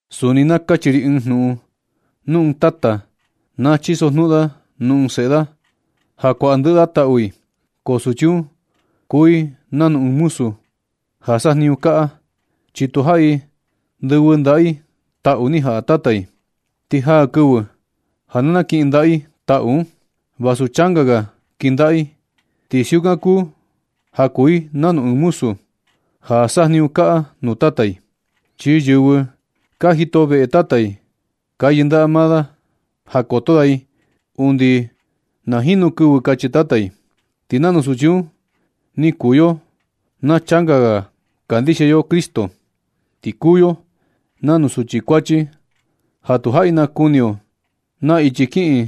Suni na kachi ri ɨɨn jnuꞌun. Nu ɨɨn tata na chisojnuꞌun da nuu ɨɨn seꞌe da ja kuaꞌa ndɨꞌɨ da taꞌu i, ko suchi un kuu i nanu ɨɨn muzu ja sajniñu kaꞌa, chi tu jaꞌi ndɨvɨ ndaꞌa i taꞌu ni jaꞌa tata i. Ti jaa kɨvɨ ja nakɨꞌɨ ndaꞌa i taꞌu un. Vasu changa ga kɨndaꞌa i ti siukan kuu ja kuu i nanu ɨɨn muzu ja sajniñu kaꞌa nuu tata i. Chi yɨvɨ ka jito veꞌe tata i, ka yɨndaꞌa da maa i ja koto da i undi na jinu kɨvɨ kachi tata i. Ti nanu suchi un ni kuu yo na changa ga kandixia yo Cristo. Ti kuu yo nanu suchi kuachi ja tu jaꞌi nakuni yo naa ichi kiꞌin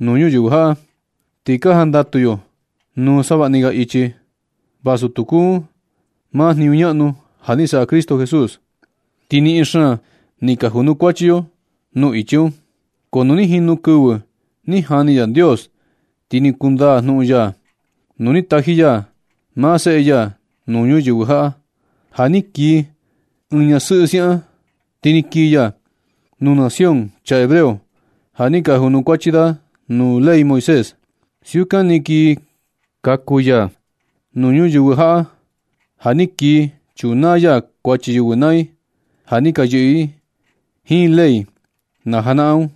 nuu ñuyɨvɨ jaꞌa. Ti ka jandatu yo nuu savaꞌni ga ichi, vasu tu kuu un maa jniñu ñaꞌnu ja ni saꞌa Cristo Jesús. Ti niꞌin xaan ni ka junukuachi yo nuu ichi un. Ko nu ni jinu kɨvɨ ni jani Yandios, ti ni kundaa jnuꞌun ya nu ni taji ya maa Seꞌe ya nuu ñuyɨvɨ jaꞌa ja ni kii ɨɨn ñasɨꞌɨ siaꞌan ni. Ti ni kii ya nuu nación chaa hebreo ja ni ka junukuachi da nuu ley Moisés. Siukan ni kii kaku ya nuu ñuyɨvɨ jaꞌa, ja ni kii chunaa ya kuachi yɨvɨ naa i ja ni ka yɨꞌɨ i jiin ley najanaꞌan un,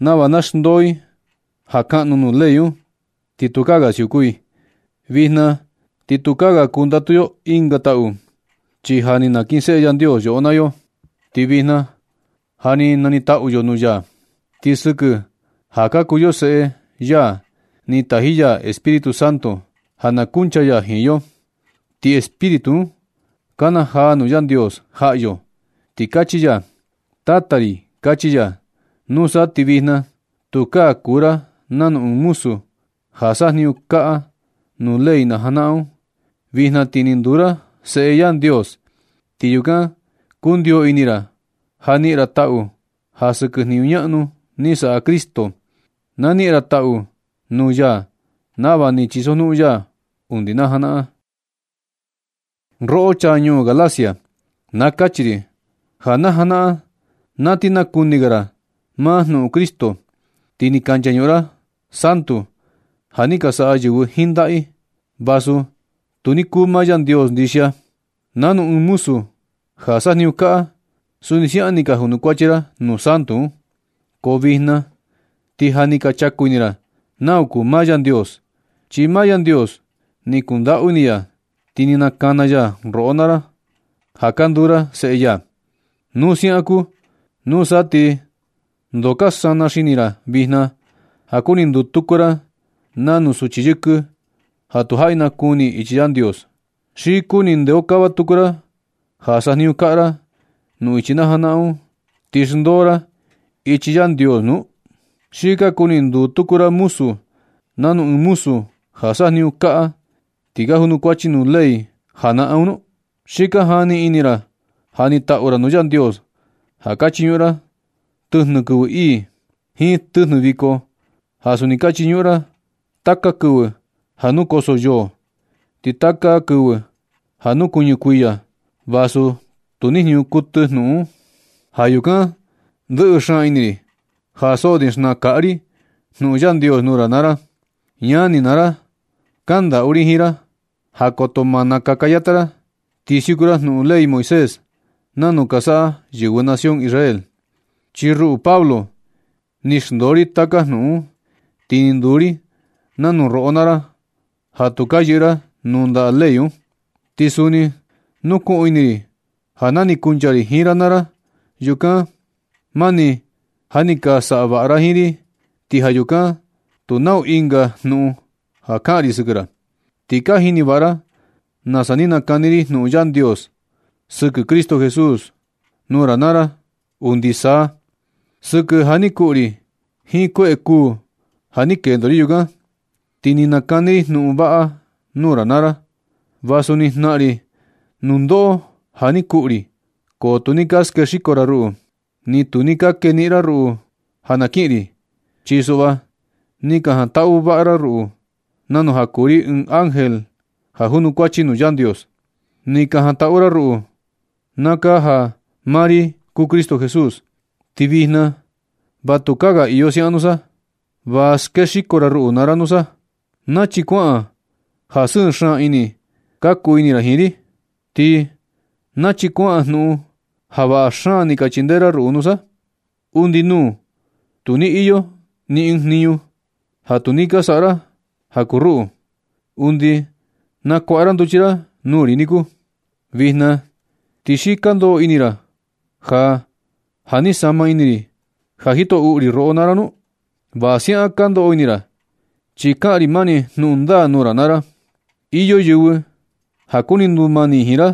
nava na xndoo i ja kaꞌnu nuu ley un ti tukaa ga siuku i. Vijna ti tukaa ga kundatu yo ɨnga taꞌu, chi ja ni nakinseꞌe Yandios yoꞌo naa yo, ti vijna ja ni niꞌin taꞌu yo nuu ya. Ti sɨkɨ ja ka kuu yo seꞌe ya ni taji ya Espíritu Santo ja na kuncha ya jiin yo, ti Espíritu un kanajaa nuu Yandios jaꞌa yo, ti kachi ya: “Tata ri”, kachi ya. Nusa ti vijna tukaa kuu ra nanu ɨɨn muzu ja sajniñu kaꞌa nuu ley najanaꞌan un. Vijna ti ni nduu ra seꞌe Yandios. Ti yukan kundio ini ra ja niꞌin ra taꞌu ja sɨkɨ jniñu ñaꞌnu ni saꞌa Cristo. Na niꞌin ra taꞌu nuu ya nava ni chisojnuꞌun ya undi najanaꞌan. Roꞌo chaa ñuu Galacia, na kachi ri ja najanaꞌan na ti nakuni ga ra maa jnuꞌun Cristo, ti ni ka nchañuꞌun ra santu ja ni ka saꞌa yɨvɨ jiin ndaꞌa i, vasu tu ni kuu maa Yandios ndixia. Nanu ɨɨn muzu ja sajniñu kaꞌa, suni siaꞌan ni ka junukuachi ra nuu santu un. Ko vijna ti ja ni ka chaku ini ra nau kuu maa Yandios. Chi maa Yandios ni kundaꞌu ini ya, ti ni nakana ya roꞌo naa ra ja ka nduu ra seꞌe ya. Nu siaꞌan kuu, nusa ti ndoo ka sana xini ra vijna ja kuni nduu tuku ra nanu suchi yɨkɨ ja tu jaꞌi nakuni i ichi Yandios. ¿Xi kuni ndeokava tuku ra ja sajniñu kaꞌa ra nuu ichi najanaꞌan un, ti xndoo ra ichi Yandios nu? ¿Xi ka kuni nduu tuku ra muzu nanu ɨɨn muzu ja sajniñu kaꞌa ti ka junukuachi nuu ley janaꞌan un nu? Xi ka jani ini ra ja nitaꞌu ra nuu Yandios ja ka chiñuꞌun ra tɨjnɨ kɨvɨ ii, jiin tɨjnɨ viko ja suni ka chiñuꞌun ra taka kɨvɨ ja nukoso yo, jiin taka kɨvɨ ja nukuɨñɨ kuiya, vasu tu ni jniñu kuɨtɨ jnuꞌun un. Ja yukan ndɨꞌɨ xaan ini ri ja so ni xnaꞌan kaꞌa ri jnuꞌun Yandios nuu ra naa ra. Ñani naa ra, kandaꞌu ri jiin ra ja koto ma na kakayata ra ti siuku ra jnuꞌun ley Moisés nanu ka saꞌa yɨvɨ nación Israel. Chi ruꞌu Pablo, ni xndoo ri taka jnuꞌun un, ti ni nduu ri nanu roꞌo naa ra ja tu ka yɨꞌɨ ra nuu ndaꞌa ley un. Ti suni nukuꞌun ini ri ja na ni kuncha ri jiin ra naa ra yukan, mani ja ni ka saꞌa vaꞌa ra jiin ri, ti ja yukan tu nau ɨnga jnuꞌun ja kaꞌan ri sɨkɨ ra. Ti ka jini vaꞌa ra nasa ni nakani ri jnuꞌun Yandios sɨkɨ Cristo Jesús nuu ra naa ra undi saa. Sɨkɨ ja ni kuꞌu ri jiin kueꞌe kuu ja ni kendo ri yukan, ti ni nakani ri jnuꞌun vaꞌa nuu ra naa ra. Vasu ni jnaꞌan ri nundoꞌo ja ni kuꞌu ri, ko tu ni ka skexiko ra ruꞌu, ni tu ni ka keniꞌin ra ruꞌu ja na kiꞌin ri. Chi suꞌva ni ka jantaꞌu vaꞌa ra ruꞌu nanu ja kuu ri ɨɨn ángel ja junukuachi nuu Yandios. Ni ka jantaꞌu ra ruꞌu na kaa ja maa ri kuu Cristo Jesús. Ti vijna va tukaa ga iyo siaꞌan nusa. Va skexiko ra ruꞌu naa ra nusa. ¿Nachi kuaꞌan ja sɨɨ xaan ni ka kuu ini ra jiin ri? ¿Ti nachi kuaꞌan jnuꞌun ja vaꞌa xaan ni ka chindee ra ruꞌu nusa? Undi nuu tu ni iyo ni ɨɨn jniñu ja tu ni ka saꞌa ra ja kuu ruꞌu, undi nakuaꞌa ra nduchi ra nuu ri niku. ¿Vijna ti xi ka ndoꞌo ini ra ja ja ni sama ini ri ja jito uꞌu ri roꞌo naa ra nu? Va siaꞌan ka ndoꞌo ini ra, chi kaꞌan ri mani jnuꞌun ndaa nuu ra naa ra. Iyo yɨvɨ ja kuni ndumani jiin ra,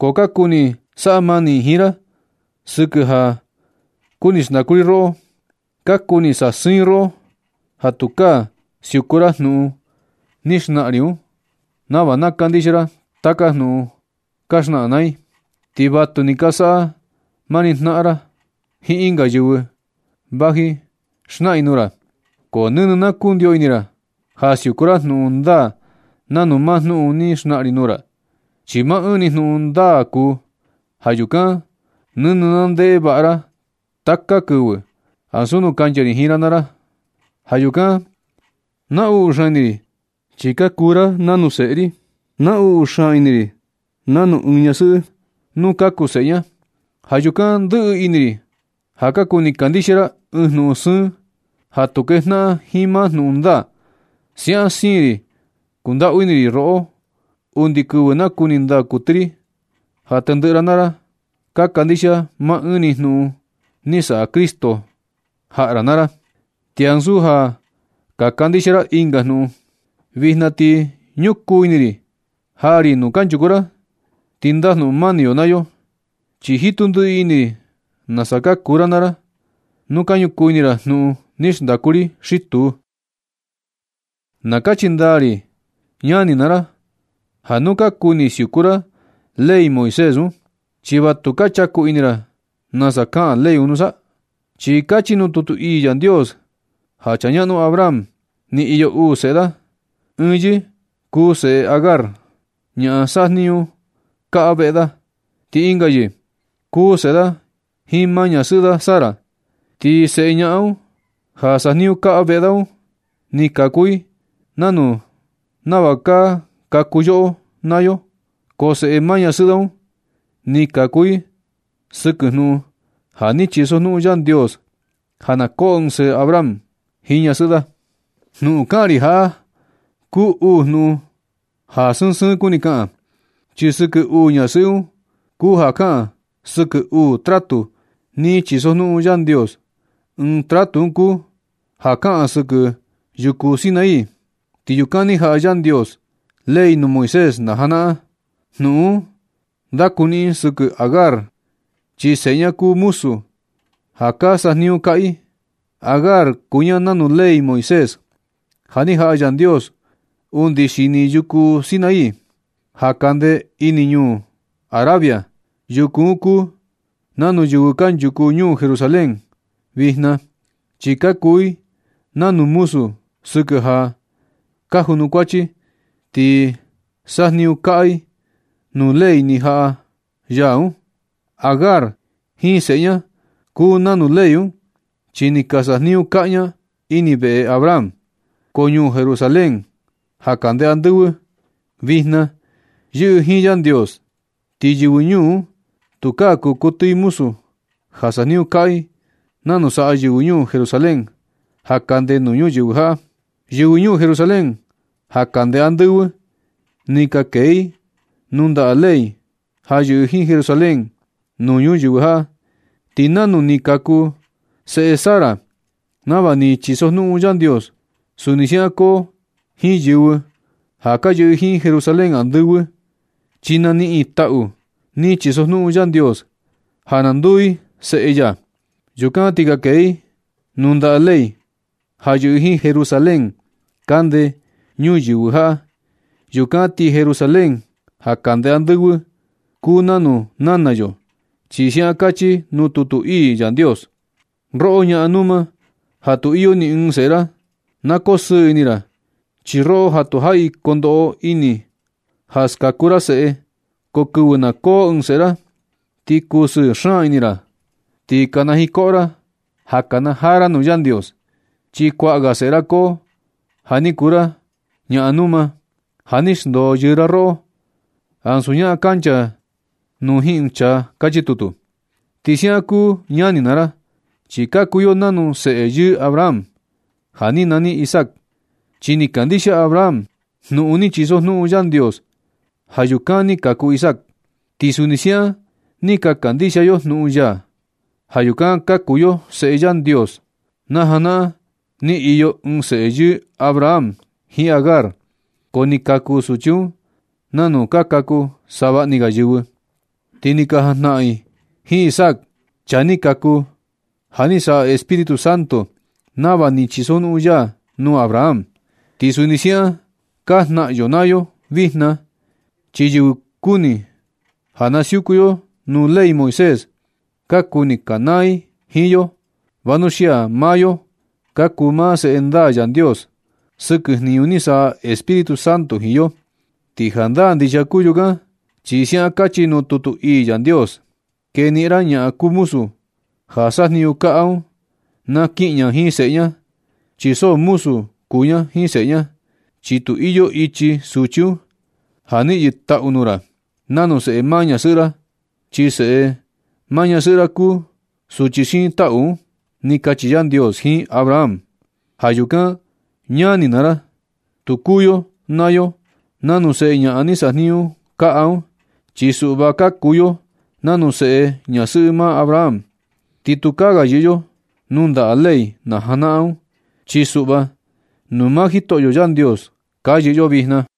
ko ka kuni saꞌa mani i jiin ra sɨkɨ ja kuni xndaꞌu i roꞌo. Ka kuni i sasɨɨn i roꞌo ja tukaa ka siuku ra jnuꞌun ni xnaꞌan ri un, nava na kandixia ra taka jnuꞌun ka xnaꞌan maa i. Ti vatu ni ka saꞌa mani jnaꞌan ra jiin ɨnga yɨvɨ vaji i xnaꞌan i nuu ra. Ko nɨnɨ na kundio ini ra ja siuku ra jnuꞌun ndaa nanu maa jnuꞌun ni xnaꞌan ri nuu ra, chi maa ɨɨn ni jnuꞌun ndaa kuu. Ja yukan nɨnɨ na ndeꞌe vaꞌa ra taka kɨvɨ, ansu nu kancha ri jiin ra naa ra. Ja yukan naꞌnu xaan ini ri chi ka kuu ra nanu seꞌe ri. Naꞌnu xaan ini ri nanu ɨɨn ñasɨꞌɨ nu kaku seꞌe ña. Ja yukan ndɨꞌɨ ini ri ja ka kuni kandixia ra ɨɨn jnuꞌun sɨɨn ja tu kejnaꞌan jiin maa jnuꞌun ndaa. Siaꞌan siin ri kundaꞌu ini ri roꞌo undi kɨvɨ nakuni ndaa kuɨtɨ ri ja tendɨꞌɨ ra naa ra ka kandixia maa ɨɨn ni jniñu ni saꞌa Cristo jaꞌa ra naa ra, ti ansu ja kandixia ra ɨnga jnuꞌun. Vijna ti ñukuu ini ri jaa ri nuu kanchuku ra ti ndajnuꞌun mani yo naa yo, chi jitu ndiꞌi ini ri nasa ka kuu ra naa ra, nu ka ñukuu ini ra jnuꞌun ni xndaku ri xi tuu. Na kachi ndaa ri ñani naa ra, ja nu ka kuni siuku ra ley Moisés un, ¿chi va tu ka chaku ini ra nasa kaꞌan ley un nusa? Chi kachi nuu tutu ii Yandios ja chaa ñaꞌnu Abraham ni iyo uu seꞌe da. Ɨɨn yɨɨ kuu seꞌe Agar, ñaꞌan sajniñu kaꞌa veꞌe da, ti ɨnga yɨɨ kuu seꞌe da jiin maa ñasɨꞌɨ da Sara. Ti seꞌe ñaꞌan ja sajniñu kaꞌa veꞌe da un ni kaku i nanu nava ka kaku yoꞌo naa yo, ko seꞌe maa ñasɨꞌɨ da un ni kaku i sɨkɨ jnuꞌun ja ni chisojnuꞌun Yandios ja na koo ɨɨn seꞌe Abraham jiin ñasɨꞌɨ da. Jnuꞌun kaꞌan ri jaꞌa kuu uu jnuꞌun ja sɨɨn sɨɨn kuni kaꞌan. Chi sɨkɨ uu ñasɨꞌɨ un kuu ja kaꞌan sɨkɨ uu tratu ni chisojnuꞌun Yandios. Ɨɨn tratu un kuu ja kaꞌan sɨkɨ yuku Sinaí, chi yukan ni jaꞌa Yandios ley nuu Moisés najanaꞌan. Jnuꞌun un ndakuniꞌin sɨkɨ Agar chi seꞌe ña kuu muzu ja ka sajniñu kaꞌa i. Agar kuu ña nanu ley Moisés ja ni jaꞌa Yandios undi xini yuku Sinaí ja kande ini ñuu Arabia. Yuku un kuu nanu yɨvɨ kanchuku ñuu Jerusalén vijna, chi ka kuu i nanu muzu sɨkɨ ja ka junukuachi ti sajniñu kaꞌa i nuu ley ni jaꞌa ya un. Agar jiin seꞌe ña kuu nanu ley un, chi ni ka sajniñu kaꞌa ña ini veꞌe Abraham. Ko ñuu Jerusalén ja kande andɨvɨ vijna yɨꞌɨ jiin Yandios, ti yɨvɨ ñuu un tukaa kuu kuɨtɨ i muzu ja sajniñu kaꞌa nanu saꞌa yɨvɨ ñuu Jerusalén ja kande nuu ñuyɨvɨ jaꞌa. Yɨvɨ ñuu Jerusalén ja kande andɨvɨ, ni ka kee i nuu ndaꞌa ley ja yɨꞌɨ jiin Jerusalén nuu ñuyɨvɨ jaꞌa. Ti nanu ni kaku seꞌe Sara nava ni chisojnuꞌun Yandios, suni siaꞌan koo jiin yɨvɨ ja ka yɨꞌɨ i jiin Jerusalén andɨvɨ, chi na niꞌin i taꞌu ni chisojnuꞌun Yandios, ja na nduu i seꞌe ya. Yukan ti ka kee i nuu ndaꞌa ley ja yɨꞌɨ jiin Jerusalén kande ñuyɨvɨ jaꞌa. Yukan ti Jerusalén ja kande andɨvɨ kuu nanu nana yo, chi siaꞌan kachi nuu tutu ii Yandios: Roꞌo ñaꞌan numa ja tu iyo ni ɨɨn seꞌe ra, na kosɨɨ ini ra. Chi roꞌo ja tu jaꞌi kondoꞌo ini ja skaku ra seꞌe, ko kɨvɨ na koo ɨɨn seꞌe ra, ti kusɨɨ xaan ini ra, ti kanajiin koꞌo ra ja kanajaa ra nuu Yandios. Chi kuaꞌa ga seꞌe ra koo ja ni kuu ra ñaꞌan numa, ja ni xndoo yɨɨ ra roꞌo, ansu ñaꞌan kancha nuu jiin ɨɨn chaa. Kachi tutu. Ti siaꞌan kuu ñani naa ra, chi ka kuu yo nanu seꞌe yɨɨ Abraham ja ni nani Isaac. Chi ni kandixia Abraham jnuꞌun ni chisojnuꞌun Yandios. Ja yukan ni kaku Isaac. Ti suni siaꞌan ni ka kandixia yo jnuꞌun ya. Ja yukan ka kuu yo seꞌe Yandios. Na janaꞌan ni iyo ɨɨn seꞌe yɨɨ Abraham jiin Agar, ko ni kaku suchi un nanu ka kaku savaꞌni ga yɨvɨ. Ti ni ka jajnaꞌan i jiin Isaac, chaa ni kaku ja ni saꞌa Espíritu Santo nava ni chisojnuꞌun ya nuu Abraham. Ti suni siaꞌan ka jnaꞌan yo naa yo vijna, chi yɨvɨ kuni ja na siuku yo nuu ley Moisés, ka kuni kanaa i jiin yo, vanuxia maa yo ka kuu maa seꞌe ndaa Yandios sɨkɨ jniñu ni saꞌa Espíritu Santo jiin yo. Ti jandaa ndixia kuu yukan, chi siaꞌan kachi nuu tutu ii Yandios: “Keniꞌin ra ñaꞌan kuu muzu ja sajniñu kaꞌa un na kiꞌin ña jiin seꞌe ña, chi so muzu kuu ña jiin seꞌe ña. Chi tu iyo ichi suchi un ja niꞌin yɨ taꞌu nuu ra nanu seꞌe maa ñasɨꞌɨ ra, chi seꞌe maa ñasɨꞌɨ ra kuu suchi xiin taꞌu un”, ni kachi Yandios jiin Abraham. Ja yukan ñani naa ra, tu kuu yo naa yo nanu seꞌe ñaꞌan ni sajniñu kaꞌa un. Chi suꞌva ka kuu yo nanu seꞌe ñasɨꞌɨ maa Abraham. Ti tukaa ga yɨꞌɨ yo nuu ndaꞌa ley najanaꞌan un, chi suꞌva nuu maa Jitoꞌyo Yandios ka yɨꞌɨ yo vijna.